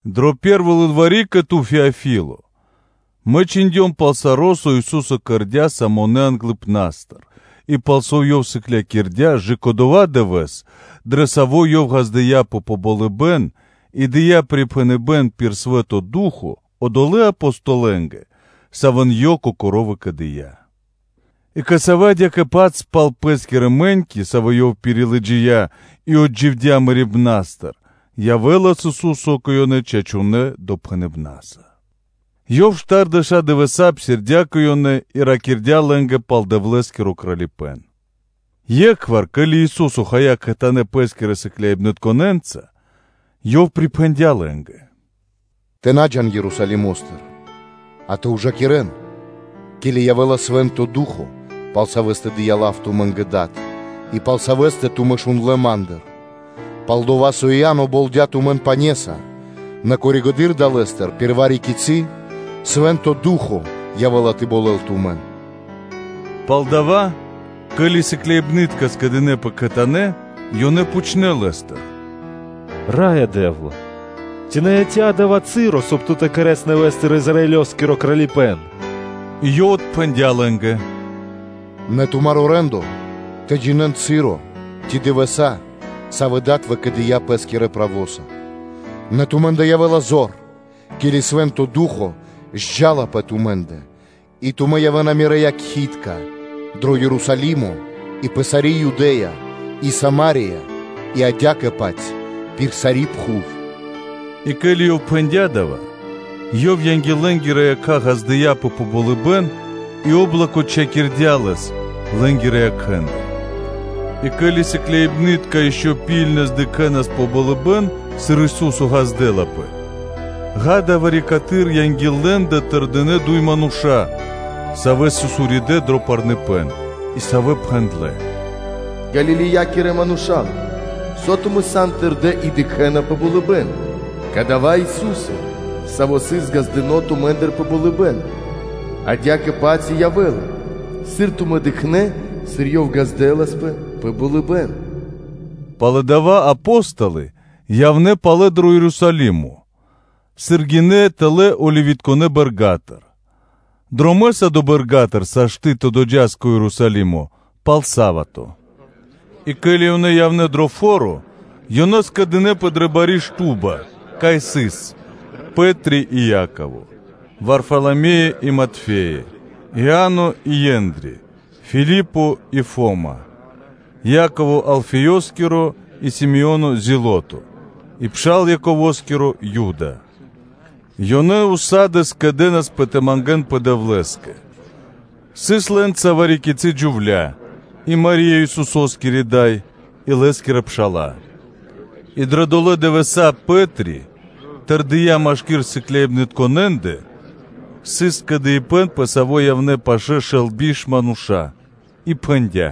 Дро пэ́рво лылвари́ кэ ту, Феофи́ле (Теофи́ле), мэ чхиндём пал саро́, со Ису́со кэрдя́ самонэ англыпна́стыр, и пал со Ёв сыклякирдя́, кэ/жы́ко дова́ дывэ́с, дро саво́ Ёв ґаздыя́пэ пэ болыбэ́н и дыя́ припхэныбэ́н пир Свэ́нто Ду́хо (Фа́но) одолэ́ Апостолэнгэ, савэ́н Ёв Кокоро́ выкэдыя́, и кэ савэ́ адя́кэ-паць палэ пал Пэ́скирэ мэ́ньки, савэ́ Ёв пирилыджия и отдживдя мэрибна́стыр, явэ́лас Ису́со кэ ёнэ чачунэ́ допхэныбнаса, и Ёв штардэша́ дывэса́ псирдя́ кэ ёнэ и ракирдя́ лэ́нгэ пал Дэвлэ́скиро Кралипэ́н. Екхвар, ке́ли Ису́со хая кхэтанэ́ Лэскирэ сыкляибнытконэ́нца, Ёв припхэндя́ лэ́нгэ: “Тэ на джа́н тумэ́ Ерусалимо́стыр, а тэ ужакирэн, ке́ли явэ́ла Свэ́нто Ду́хо (Фа́но), пал саво́ дыя́ лав тумэ́нгэ Дад, и пал саво́ тумэ́ шундлэ́ Ма́ндыр; пал-дова́ со Иа́но болдя тумэн пане́са, нэ коригэды́р (позжэды́р) далэ́стыр пир вари-кицы́ часо Свэ́нто Ду́хо (Фа́но) явэ́ла тэ болэл тумэн.” Палдава́, ке́ли сыкляибны́тка скэдынэ́пэ кхэтанэ́, ёнэ пхучнэ́ Лэ́стыр: “Ра́ё Дэ́вла! Ци на яця́ дава́ часо, соб (кай) Ту тэ кэрэ́с нэвэ́стыр Израилёскиро Кралипэ́н?” И Ёв отпхэндя́ лэ́нгэ: “На тумаро́ рэ́ндо (де́ло) тэ джинэ́н часо ци дывэса́, савэ́ Дад выкэдыя́ Лэскирэ правоса; нэ тумэ́ндэ явэ́ла зор, ке́ли Свэ́нто Ду́хо (Фа́но) джал тэлэ́ пэ тумэ́ндэ, и тумэ́ явэ́на Мирэ́ якхи́тка (свидетели) дро Ерусалимо и пэ сари́ Юдэ́я и Сама́рия и адя́кэ-паць пир сари́ пхув.” И ке́ли Ёв пхэндя́ дава́, Ёв ґаздыя́пэ пэ болыбэ́н анги́л лэ́нгирэ якха́, и о́блоко чхакирдя Лэс лэ́нгирэ якхэ́ндыр. И ке́ли сыкляибны́тка ишчо (инкэ́) дыкхнэ́ пэ болыбэ́н, сыр Ису́со ґаздэласпэ, акэ, вари-каты́р анги́л лэ́ндэ тэрдинэ́ дуй мануша́, савэ́ сыс уридэ́ дро парныпэн, и савэ́ пхэндлэ́: “Ѓалилеякирэ Мануша́лэ! Со тумэ́ сан тэрдэ́ и дыкхэ́на пэ болыбэ́н? Кадава́ Ису́со, Саво́ сыс ґаздыно́ тумэ́ндыр пэ болыбэ́н, адя́кэ-паць и явэ́ла, сыр тумэ́ дыкхнэ́, сыр Ёв ґаздэласпэ пэ болыбэ́н.” Пало́ дава́ Апо́столы явнэ́ палэ дро Ерусалимо, сыр гинэ́ тэлэ́ Оливитконэ (Елеоноскирэ) бэрга́тыр; дромэ́са долэ́ бэрга́тыр сашты́ (можна) тэ доджас кэ Ерусалимо пал са́вато (субо́та). И ке́ли ёнэ явнэ́ дро фо́ро, ёнэ скэдынэ́пэ дрэ бари шту́ба (комната), кай сыс: Пэ́три (Пётр) и Яково, Варфаламеё и Матфеё, Иа́но и Ендри (Андреё), Филипо и Фама, Яково Алфеёскиро и Си́моно Зилото, и пшал Яково́скиро, Юда. Ёнэ кхэтанэ́ скэдэнаспэ тэ мангэ́нпэ Дэвлэ́скэ; сыс лэ́нца вари-кицы́ джувля́ и Мари́я, Исусо́скири Дай, и Лэ́скирэ пша́ла. И дрэ долэ́ дывэса́ о Пэ́три, тэрдия́ машки́р сыкляибнытконэндэ (сыс скэдыибэ́н, пэ саво́ явнэ́ пашы́л шэл тэ биш мануша́) и пхэндя́: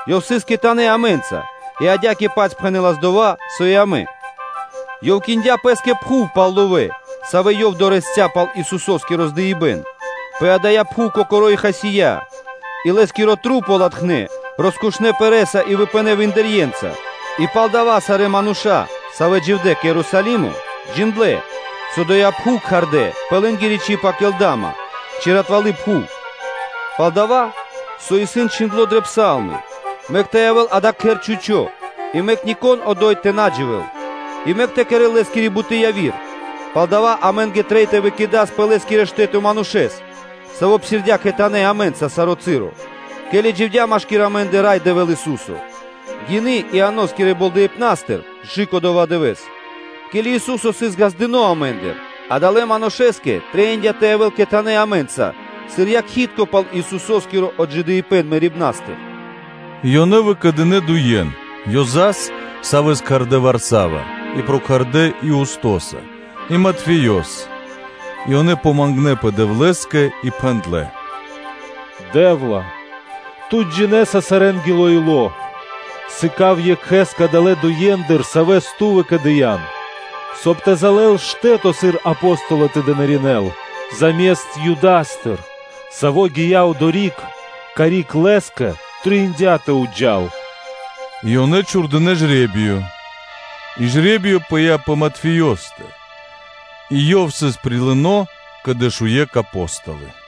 Ёв сыс гиндло кхэтанэ́ амэ́нца, и адя́кэ-паць пхэнэлас дова́, со и амэ. Ёв киндя пэ́скэ пхув пал ловэ́, савэ́ ёв дорэсця́ пал Исусо́скиро здыибэн, пэ дая́ пхув кокоро́ и хасия́, и лэ́скиро тру́по латхнэ́ роскушнэ пэрэ́са и выпынэ́ виндырье́нца. И пал дава́ сарэ́ мануша́, савэ́ дживдэ́ кэ Ерусалимо, джиндлэ́, со доя́ пхув кхардэ́ пэ лэ́нгири чиб Акелдама, ци “ратвалы пхув.” Пал-дава́ со исын чхиндло́ дрэ Псалмы: “Мэк тэ явэ́л дава́ кхэр чхучо́, и мэк нико́н одо́й тэ на дживэ́л, и мэк тэ кэрэ́л лэ́скири буты́ яви́р.” Палдава́ амэ́нгэ трэй тэ выкэдас пэ лэ́скиро штэ́то манушэ́с, саво́ псирдя́ кхэтанэ́ амэ́нца саро́ часо, ке́ли дживдя́ машки́р амэ́ндэ Рай Дэвэ́л Ису́со, гины Ианоскирэ болдэипнастыр кэ/жы́ко дова́ дывэ́с, ке́ли Ису́со сыс ґаздыно́ амэ́ндыр, адалэ́ манушэ́скэ трэиндя́ тэ явэ́л кхэтанэ́ амэ́нца сыр якхи́тко пал Исусо́скиро отджидыибэн мэрибна́стыр, И ёнэ выкэдынэ́ дуе́н: Ёзас (Иосифос), савэ́с кхардэ́ Варсава, и прокхардэ Иустоса, и Матфеёс. И ёнэ мангнэпэ Дэвлэ́скэ и пхэндлэ́: “Дэ́вла! Ту джинэ́са сарэнгиро ило́, сыка́в екхэ́с кадалэ́ дуендыр, савэ́с Ту выкэдыян, соб (кай) тэ залэл штэ́то, сыр Апостоло тэ дынаринэ́л заме́ст Юдастэ, саво́ гия́ одори́к, карик лэ́скэ трэиндя́ тэ джал пэ́скэ.” И ёнэ чхурдынэ́ жре́биё, и жре́биё пыя́ пэ Матфеёстэ; и ёв сыс прилыно кэ дэшуекх Апо́столы.